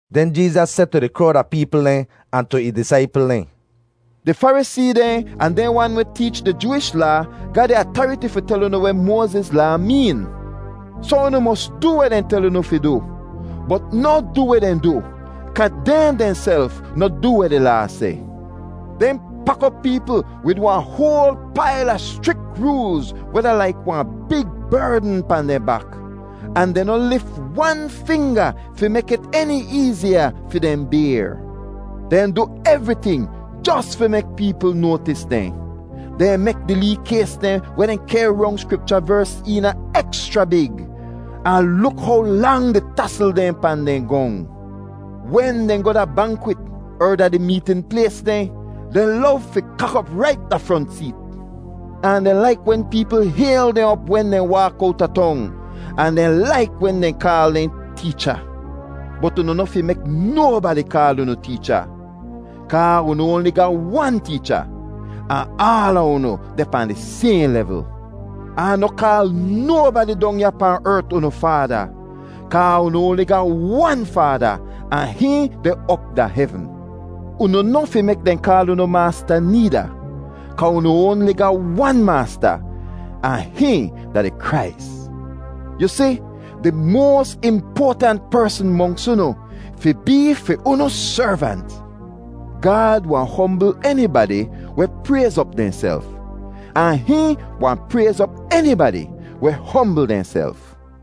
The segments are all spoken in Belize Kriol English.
Den Jeezas seh tu di krowd a peepl dehn ahn tu ih disaipl dehn, “Di Farisee dehn ahn dehn wan weh teech di Jooish Laa ga di atariti fi tel unu weh Moaziz Laa meen. Soh unu mos du weh dehn tel unu fi du, bot noh du weh dehn du, kaa dehn dehnself noh du weh di Laa seh. Dehn pak op peepl wid wahn hoal pail a schrik roolz weh da laik wahn big berdn pahn dehn bak, ahn dehn noh lif wan finga fi mek it eni eeziya fi dehn bayr. “Dehn du evriting jos fi mek peepl noatis dehn. Dehn mek di lee kays dehn weh dehn kehr rong Skripcha vers eena ekschra big, ahn luk how lang di tasl dehn pahn dehn gong! Wen dehn goh da bankwit er da di meetn plays dehn, dehn lov fi kak op rait da front seet. Ahn dehn laik wen peepl hayl dehn op wen dehn waak owta tong, ahn dehn laik wen dehn kaal dehn ‘Teecha.’ “Bot unu noh fi mek nobadi kaal unu ‘Teecha’ kaa unu oanli ga wan Teecha, ahn aala unu deh pahn di sayhn levl. Ahn noh kaal nobadi dong ya pahn ert unu ‘Faada’ kaa unu oanli ga wan Faada ahn hihn deh op da hevn. Unu noh fi mek dehn kaal unu ‘Maasta’ needa, kaa unu oanli ga wan Maasta ahn hihn da di Krais. Yu si, di moas impoatant persn monks unu fi bee fi unu servant. Gaad wahn hombl enibadi weh prayz op dehnself, ahn hihn wahn prayz op enibadi weh hombl dehnself.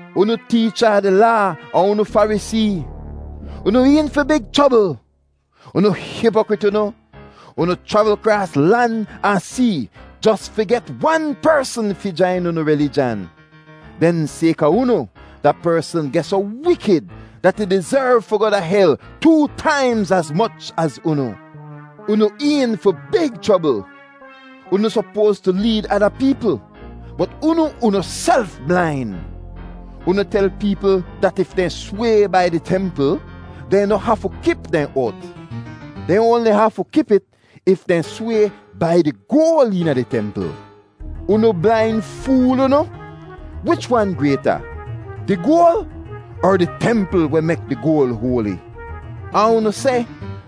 “Unu teecha a di Laa ahn unu Farisee, unu een fi big chrobl. Unu hipokrit unu! Unu chravl kraas lan ahn see jos fi get wan persn fi jain unu rilijan. Den sayka unu, da persn geh soh wikid dat ih dizerv fi goh da hel too taimz az moch az unu. “Unu een fi big chrobl. Unu sopoas tu leed ada peepl bot unu unuself blain. Unu tel peepl dat if dehn sway ‘bai di templ,’ dehn noh hafu kip dehn oat; dehn oanli hafu kip it if dehn sway ‘bai di goal eena di templ.’ Unu blain fool unu! Wich wan grayta, di goal er di templ weh mek di goal hoali? Ahn unu seh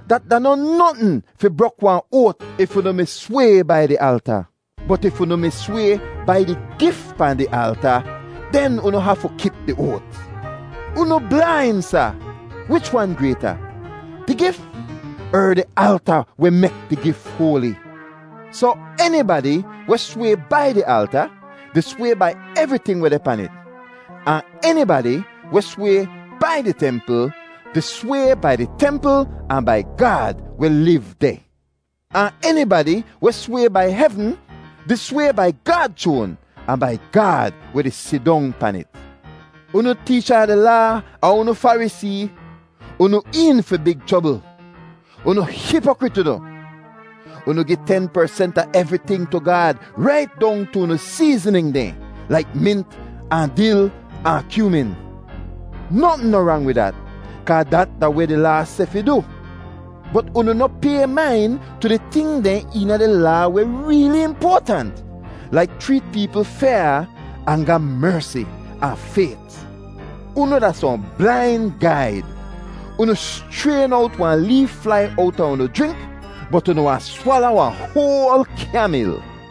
dat da noh notn fi brok wahn oat if unu mi sway ‘bai di alta,’ bot if unu mi sway ‘bai di gif pahn di alta,’ den unu hafu kip di oat. Unu blain, sa! Wich wan grayta, di gif er di alta weh mek di gif hoali? Soh enibadi weh sway ‘bai di alta’ di sway bai evriting weh deh pan it; ahn enibadi weh sway ‘bai di templ’ di sway bai di templ ahn bai Gaad weh liv deh. Ahn enibadi weh sway ‘bai hevn’ di sway bai Gaad chroan ahn bai Gaad weh di sidong pan it. “Unu teecha a di Laa ahn unu Farisee, unu een fi big chrobl. Unu hipokrit unu! Unu gi ten persent a evriting tu Gaad rait dong tu unu seeznin dehn laik mint ahn dil ahn kyoomin. Notn noh rang wid dat kaa dat da weh di Laa seh fi du, bot unu noh pay main tu di ting dehn eena di Laa weh reeli impoatant, laik chreet peepl fyaa, ahn ga mersi ahn fayt. Unu da sohn blain gaid. Unu schrayn owt wahn lee flai owta unu jrink, bot unu wahn swala wahn hoal kyamil!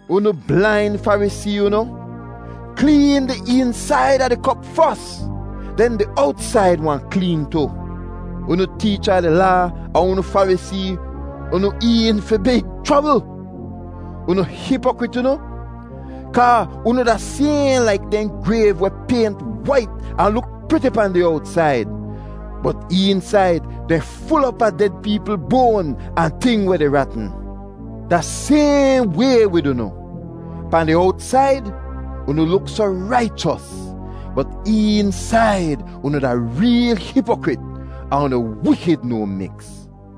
Unu blain Farisee unu! Kleen di eensaid a di kop fos, den di owtsaid wahn kleen tu. “Unu teecha a di Laa ahn unu Farisee, unu een fi big chrobl. Unu hipokrit unu! Kaa unu da sayhn laik dehn grayv weh paynt wait ahn luk priti pahn di owtsaid, bot eensaid dehn ful op a ded peepl boan ahn ting weh di ratn. Da sayhn way wid unu—pahn di owtsaid unu luk soh raichos, bot eensaid unu da reel hipokrit ahn unu wikid no miks.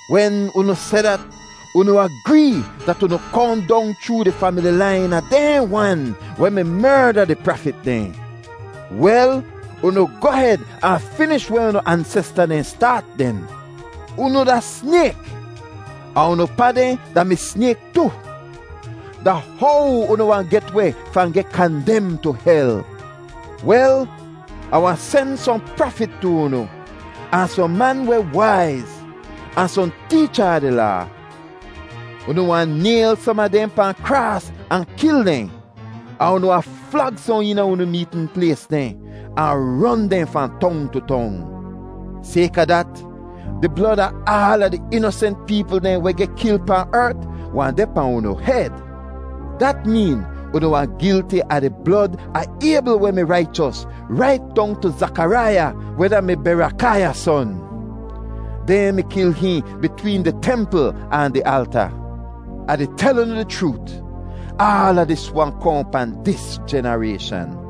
Wen unu seh dat, unu agree dat unu kohn dong chroo di famili lain a dehn wan weh mi merda di prafit dehn. Wel, unu goh hed ahn finish weh unu ansesta dehn staat den. “Unu da snayk ahn unu pa dehn da-mi snayk tu! Da how unu wahn get weh fahn geh kandem tu hel? Wel, Ah wahn sen sohn prafit tu unu, ahn sohn man weh waiz, ahn sohn teecha a di Laa. Unu wahn nayl som a dehn pahn kraas ahn kil dehn, ahn unu wahn flag sohn eena unu meetn plays dehn ahn ron dehn fahn tong tu tong. Sayka dat, di blod a aala di inosent peepl dehn weh geh kil pahn ert wahn deh pahn unu hed. Dat meen unu wahn gilti a di blod a Aybl weh mi raichos, rait dong tu Zakaraiya weh da-mi Berakaiya son. Dehn mi kil hihn bitween di templ ahn di alta. Ah di tel unu di chroot, aala dis wahn kohn pahn dis jenarayshan.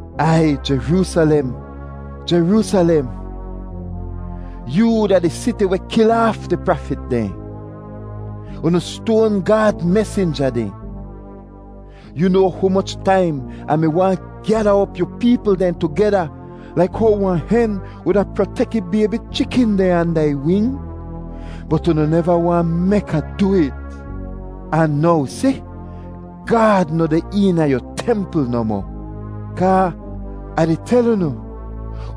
“Aiy Jeroosalem, Jeroosalem, yoo da di siti weh kil aaf di prafit dehn; unu stoan Gaad mesinja dehn! Yu noa humoch taim Ah mi waahn gyada op yu peepl dehn tugeda laik how wahn hen wuda protek ih baybi chikin dehn anda ih wing? Bot unu neva waahn mek Ah du it. Ahn now si, Gaad noh deh eena yu templ nohmoh. Kaa Ah di tel unu,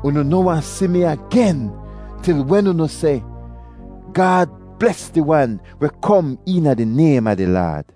unu noh wahn si mi agen til wen unu seh, ‘Gaad bles di Wan weh kom eena di naym a di Laad.’”